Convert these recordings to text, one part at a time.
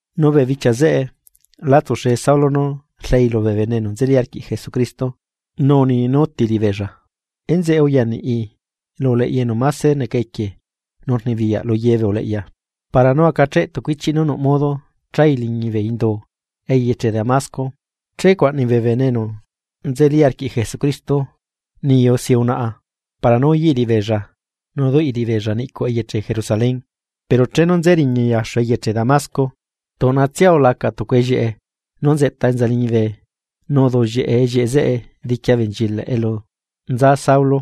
Nu bee bichia zeꞌe, la tsuxe Saulo nú rleei lubee bene enu nzeli arquiꞌ Jesucristo, nu uni nú úti liꞌibeella. Enzeꞌe uyaniꞌi lu uleꞌya enu máse neca equie nu rnibiyaꞌ lu ye bee uleꞌya, para nú acacheꞌ tucu ichiꞌ nú nuꞌ modo chai liñi bee indu eyeche Damasco che cuaꞌnai bee bene enu nzeli arquiꞌ Jesucristo niyu si unaꞌa para nú uyaꞌi liꞌibeella nu duꞌi liꞌibeella niꞌcuꞌ eyeche Jerusalén. Pero chenu nze riñai axu eyeche Damasco, tuꞌnatsia ulaca tucu ellieꞌe nú nzeꞌta enza liñibe nu uduꞌllieꞌe ellieꞌe zeꞌe diqui abenchilaꞌ elu nza Saulo.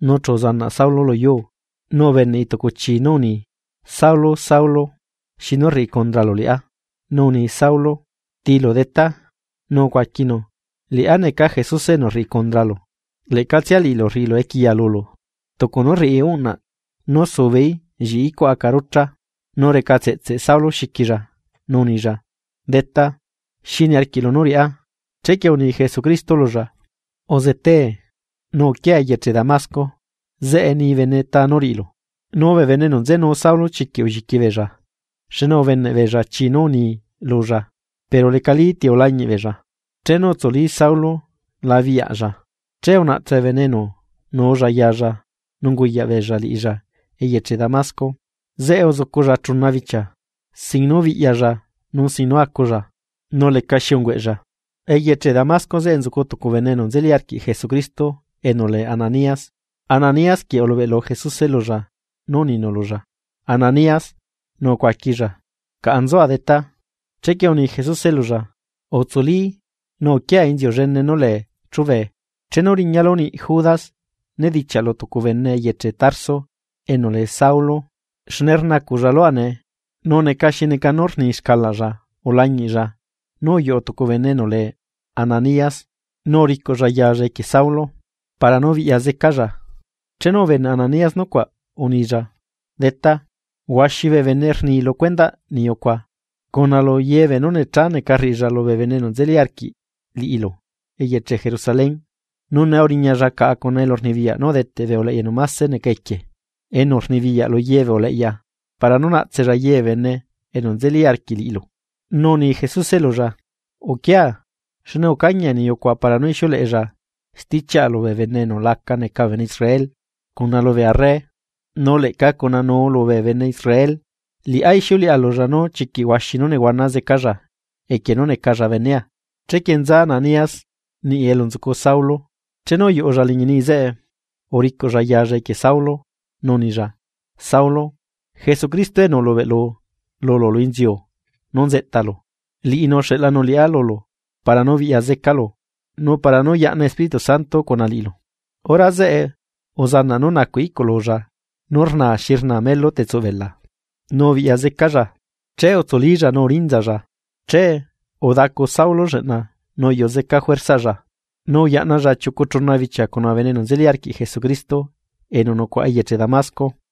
Nu chu uzanaꞌ Saulo luyuu, nu ubeneꞌi tucu chii nú uni: ―Saulo, Saulo, ¿xinu rriꞌi condralu liꞌá? Nu uni Saulo: ―¿Tiilu, Detá? Nu ucuaquinu: ―Liꞌá neca Jesuse enu rriꞌi condralu, leꞌcatsia liꞌilu rriꞌilu equiya lulu. Tucu nú rriꞌi uꞌnaꞌ nú subeí lliꞌi icuꞌ aca rucha. Nu recatseꞌtseꞌ Saulo xiquilla, nu unilla: ―Detá, ¿xi niarquiꞌlu nú riꞌá? Chequie uni Jesucristo lulla: ―Uzetee, nu uquia eyeche Damasco, zeꞌe ni bene ta nú riꞌilu. Nu bee bene enu nzenu Saulo chiquiꞌ ulliqui beella, xne ubeneꞌ beella chii nú uni lulla, pero lecalí ti ulañiꞌ beella. Chenu utsuli Saulo la biꞌyaꞌlla, che unaꞌtse bee bene enu nuulla yalla nu unguyaꞌbeella liꞌilla eyeche Damasco. Zeꞌe uzuculla chuna bichia, sin nú biꞌyalla nu sin nú aculla, nu lecaxi ungueꞌlla. Eyeche Damasco zeꞌe nzucu tucu bene enu nzeli arquiꞌ Jesucristo enu lee Ananías, Ananías quieꞌ ulubeꞌlu Jesuse lulla nu uninu lulla: ―¡Ananías! Nu ucuaquilla: ―Caꞌa nzua, Detá. Chequie uni Jesuse lulla: ―Utsuli nu uquia inziu llene nú lee chubee, chenu riñalu niꞌ Judas nedichiaꞌlu tucu bene eyeche Tarso enu lee Saulo. Xne rnacuꞌlla lua nee, nu neca xi neca nú rni xcalaꞌlla ulañiꞌlla nú uyuꞌu tucu bene enu lee Ananías nu uricuꞌlla yalla equie Saulo, para nú biꞌya zecalla. Chenu ubeneꞌ Ananías nucuaꞌ, unilla: ―Detá, huaxi bee bene rni lu cuendaꞌ niyu cuaꞌ, cuna lu ye beenú necha neca rriꞌilla lubee bene enu nzeli arquiꞌ liꞌilu eyeche Jerusalén. Nu nee uriñalla caꞌa cuna elurnibiyaꞌ nú udeteꞌ bee uleꞌya enu máse neca equie nu rnibiyaꞌ lu ye bee uleꞌya para nú naꞌtsella ye bee bene enu nzeli arquiꞌ liꞌilu. Nu uni Jesuse lulla: ―Uquia, xne ucañia niyu cuaꞌ para nú ixiuleꞌella stichiaꞌa lubee bene enu la neca bee bene Israel, cuna lubee arre, nu leꞌca cuna nuu lubee bene Israel. Liꞌá ixiuleꞌa lulla nú chiquiꞌ huaxi nú nehuana zecalla equie nú necalla benea. Chequie nza Ananías niꞌi elu nzucu Saulo. Chenu uyuꞌulla liñi niꞌi zeꞌe, uricuꞌlla yaalla equie Saulo, nu unilla: ―Saulo, Jesucristo enu ulubeꞌlu lulu lu inziu nú nzeꞌtalu, liꞌinu uxeꞌlanu liꞌá lulu para nú biꞌya zecalu, nu para nú yaꞌna Espíritu Santo cuna liꞌilu. Hora zeꞌe uzanaꞌ nú nacuꞌ iꞌcululla nú rna xi rna melu tsuꞌ bela, nu ubiꞌya zecalla. Che utsulílla nu urinzalla. Che udacu Saulo lleꞌna nú udaculla nu uyuꞌu zeca juerzaꞌlla, nu uyaꞌnalla chiucu chuna bichia cuna bee bene enu nzeli arquiꞌ Jesucristo enu nucuaꞌa eyeche Damasco.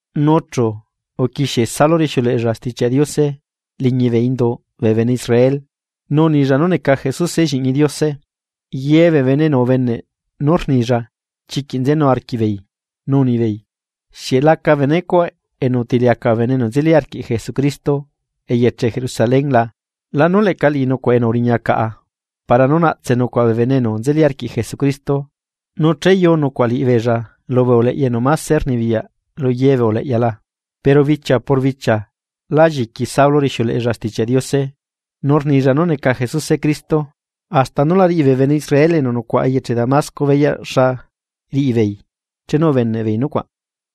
Nu chu uquixie Saulo rixiuleꞌella Stichiaꞌ Diose liñi bee induꞌ bee bene Israel, nu unilla nú neca Jesuse Lliꞌñi Diose. Ye bee bene enu ubeneꞌ nú rnilla chiquiꞌ nzenu arquiꞌbeei, nu unibeei: ―¿Xieꞌ laca benecuaꞌ enu utiliacaꞌ bee bene enu nzeli arquiꞌ Jesucristo eyeche Jerusalén la? ¿Lanu leꞌca liꞌi nucuaꞌ enu uriña caꞌa para nú naꞌtse nucuaꞌ bee bene enu nzeli arquiꞌ Jesucristo nu cheyu nucuaꞌ liꞌibeella lubee uleꞌya enu máse rnibiyaꞌ lu ye bee uleꞌya la? Pero bichia por bichia la lliqui Saulo rixiuleꞌella Stichiaꞌ Diose, nu rnilla nú neca Jesuse Cristo, hasta nú la riꞌi bee bene Israel enu nucuaꞌa eyeche Damasco beyaꞌ xa riꞌibeei chenu ubeneꞌbeei nucuaꞌ.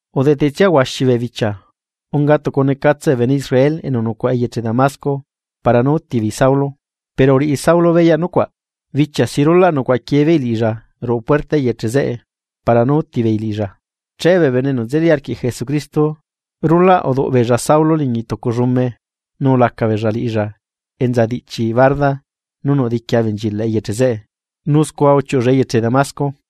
Udetetsia huaxi bee bichia, unga tucu necatse bee bene Israel enu nucuaꞌa eyeche Damasco para nú úti beei Saulo, pero uriꞌi Saulo beyaꞌ nucuaꞌ. Bichia si rulaꞌ nucuaꞌa quiebeei liꞌilla ruꞌu puerta eyeche zeꞌe para nú útibeei liꞌilla, che bee bene enu nzeli arquiꞌ Jesucristo rulaꞌ uduꞌ beella Saulo liñi tucu llume nu ulaca beella liꞌilla enza diꞌchi barda nú nuꞌ diqui abenchilaꞌ eyeche zeꞌe, nu scua uchiuꞌulla eyeche Damasco.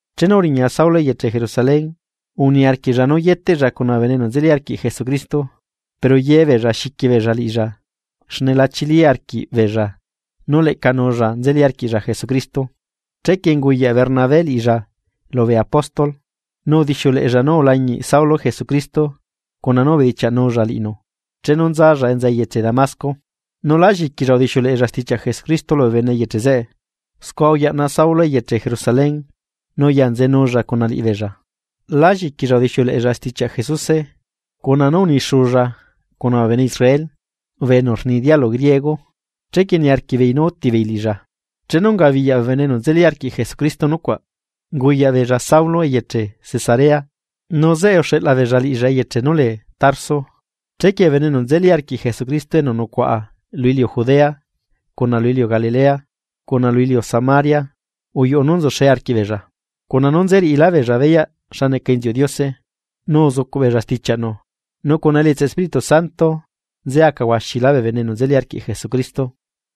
Chenu uriña Saulo eyeche Jerusalén, uniarquiꞌlla nú yeteꞌlla cuna bee bene enu nzeli arquiꞌ Jesucristo, pero ye beella xiqui beella liꞌilla xne la chili arquiꞌbeella nú leꞌca nulla nzelíla arquiꞌlla Jesucristo. Chequie unguyaꞌ Bernabé liꞌilla lubee apóstol. Nu udixiuleꞌella nú ulañiꞌ Saulo Jesucristo cuna nú ubedichiaꞌnulla liꞌinu chenu nzalla enza eyeche Damasco, nu la lliquilla udixiuleꞌella stichiaꞌ Jesucristo lubee bene eyeche zeꞌe. Scua uyaꞌna Saulo eyeche Jerusalén, nu uyanzeenulla cuna liꞌibeella. Lá lliquilla udixiuleꞌella stichiaꞌ Jesuse, cuna nú unixulla cuna bee bene Israel enu rni dialu griego, chequie niarquiꞌbeei nú útibeei liꞌilla. Chenu ungabiyaꞌ bee bene enu nzeli arquiꞌ Jesucristo nucuaꞌ, unguyaꞌbeella Saulo eyeche Cesarea, nu zeꞌe uxeꞌla beella liꞌilla eyeche nú lee Tarso. Chequie bee bene enu nzeli arquiꞌ Jesucristo enu nucuaꞌa lu iliu Judea, cuna lu iliu Galilea, cuna lu iliu Samaria, uyuꞌu nú nzuxe arquiꞌbeella, cuna nú nze riꞌilá beella beyaꞌ xa neca inziuꞌ Diose, nu uzucuꞌbeella stichiaꞌnu, nu cuna elietsaꞌ Espíritu Santo nze aca huaxilá bee bene enu nzeli arquiꞌ Jesucristo.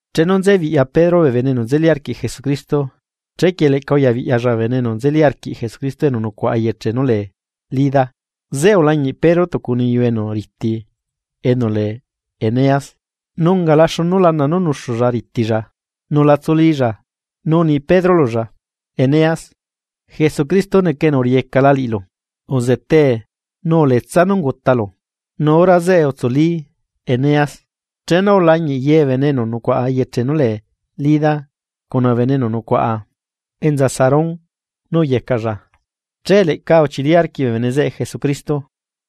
Chenu nzebiꞌya Pedro bee bene enu nzeli arquiꞌ Jesucristo, chequie leꞌca uyabiꞌyalla bee bene enu nzeli arquiꞌ Jesucristo enu nucuaꞌa eyeche nú lee Lida. Zeꞌe ulañiꞌ Pedro tucu niyu enu riti enu lee Eneas, nu ungala xunu lana nú nuxulla ritilla, nu la tsulílla. Nu uni Pedro lulla: ―Eneas, Jesucristo neca enu uriꞌiyecala liꞌilu. Uzetee nu uletsa nú ungutalu. Nu hora zeꞌe utsuli Eneas. Chenu ulañiꞌ ye bee bene enu nucuaꞌa eyeche nú lee Lida cuna bee bene enu nucuaꞌa enza Sarón nú uyecaꞌlla, che leꞌca uchili arquiꞌ bee bene zeꞌe Jesucristo.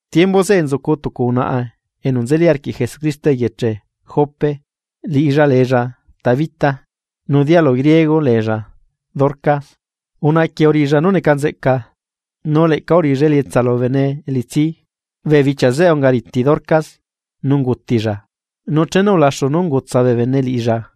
Tiembu zeꞌe nzucu tucu unaꞌa enu nzeli arquiꞌ Jesucristo eyeche Jope liꞌilla leella Tabita, nu dialu griego leella Dorcas. Unaꞌa quieꞌ uriꞌilla nú neca nzeꞌca, nu leꞌca uriꞌilla elietsa lubee bene elitsi. Bee bichia zeꞌe ungariti Dorcas nu ungutilla, nu chenu ulaxu nú ungutsa bee bene liꞌilla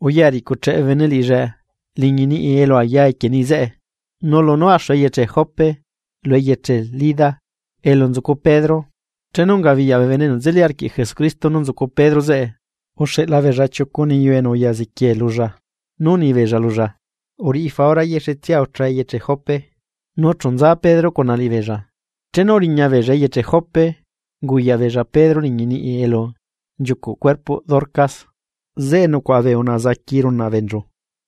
uya ricucheꞌe bee bene liꞌilla liñi niꞌi elu aya equie niꞌi zeꞌe. Nu lunú axu eyeche Jope lu eyeche Lida, elu nzucu Pedro, chenu ungabiyaꞌ bee bene enu nzeli arquiꞌ Jesucristo nú nzucu Pedro zeꞌe, uxeꞌla beella chiucu niyu enu uya ziquiee lulla, nu unibeella lulla: ―Uriꞌi faura yexetsia ucha eyeche Jope. Nu chu nza Pedro cuna liꞌibeella. Chenu uriña beella eyeche Jope, unguyaꞌbeella Pedro liñi niꞌi elu nchiucuꞌ cuerpoꞌ Dorcas, zeꞌe nucuaꞌa bee unaꞌa zaqui runaꞌ beenchu,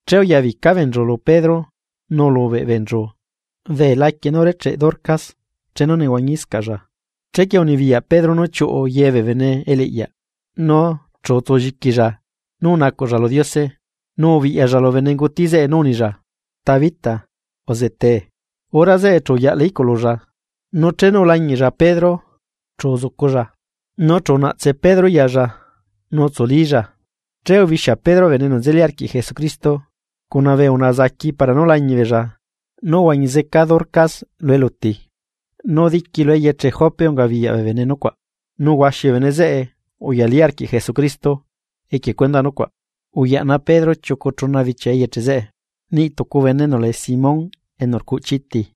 che uyabica beenchu lu Pedro nu ulubeꞌ beenchu bee laquie nú urecheꞌe Dorcas chenu nehuañiscaꞌlla. Chequie unibiyaꞌ Pedro nú chiuꞌu ye bee bene eliꞌyaꞌ, nu chu utsulliquilla nu unacuꞌlla lu Diose, nu ubiꞌyalla lu benenguti zeꞌe nu unilla: ―¡Tabita, uzetee! Hora zeꞌe chu uyaꞌla iꞌcululla, nu chenu ulañiꞌlla Pedro, chu uzuculla. Nu chu unaꞌtse Pedro yalla nu utsulílla, che ubixia Pedro bee bene enu nzeli arquiꞌ Jesucristo, cuna bee unaꞌa zaqui para nú lañiꞌ beella nú uhuañi zeca Dorcas lu eluti. Nu diqui lu eyeche Jope ungabiyaꞌ bee bene nucuaꞌ, nu huaxi bee bene zeꞌe uyalí arquiꞌ Jesucristo equie cuendaꞌ nucuaꞌ. Uyaꞌna Pedro chiucu chuna bichia eyeche zeꞌe, niꞌ tucu bene enu lee Simón enu rcuꞌchi iti.